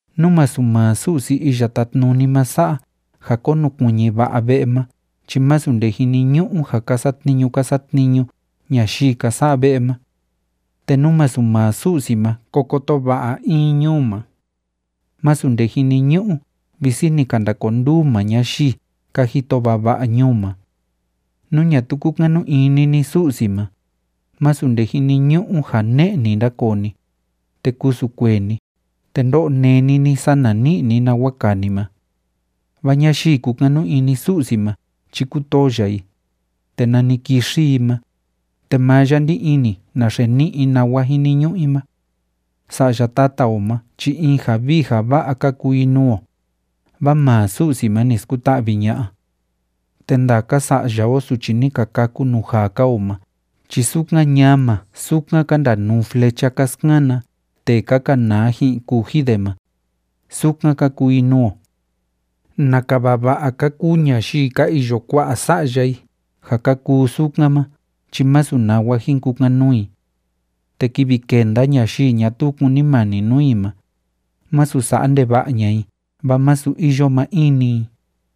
Nú masu maa Su'si Iya Tátnuni ma sa'a ja konukuiñi va'a ve'e ma chi masu nde jiniñu'u ja ka satniñu ka satniñu ñayii ka sa'a ve'e ma. Te nú masu maa Su'si ma ko koto va'a in ñuu ma, másu nde jiniñu'u visi ni ka ndakonduu maa ñayii ka jito vava'a ñuu ma. Nú ñatuu kúkanu ini ni Sa'si ma, másu nde jiniñu'u ja ne'e‑ni ndakoo ni, te kusu kuee ni, te ndo'o neni ni sana ni'i ni nawa kaa ni ma. Vaa ñayii kúkanu ini Su'si ma chi kútoo ya i, te nani kixi i ma, te maa ya ndí ini naxe ni'i i nawa jiniñu'u i ma. Sa'ya tata o ma chi in ja vii ja va'a ka kuu i nuu o, vaa maa Su'si ma ni skuta'vi ña'a. Te ndaka sa'ya o suchi ni ka kâku nuu jaa‑ka o ma chi sukan ñama sukan ka ndanuu flecha ka skana tee ka kanaa ji'in kuji de ma, sukan ka kuu i nuu o. ¡Naka vava'a ka kuu ñayii ka iyo kua'a sa'ya i ja ka kuu sukan ma chi másu nawa jin kukan‑nuu i! Te kivi kenda ñayii ñatuu kunimani nuu i ma, masu sa'a ndeva'a ña'a i vaa masu iyo maa in-ni i.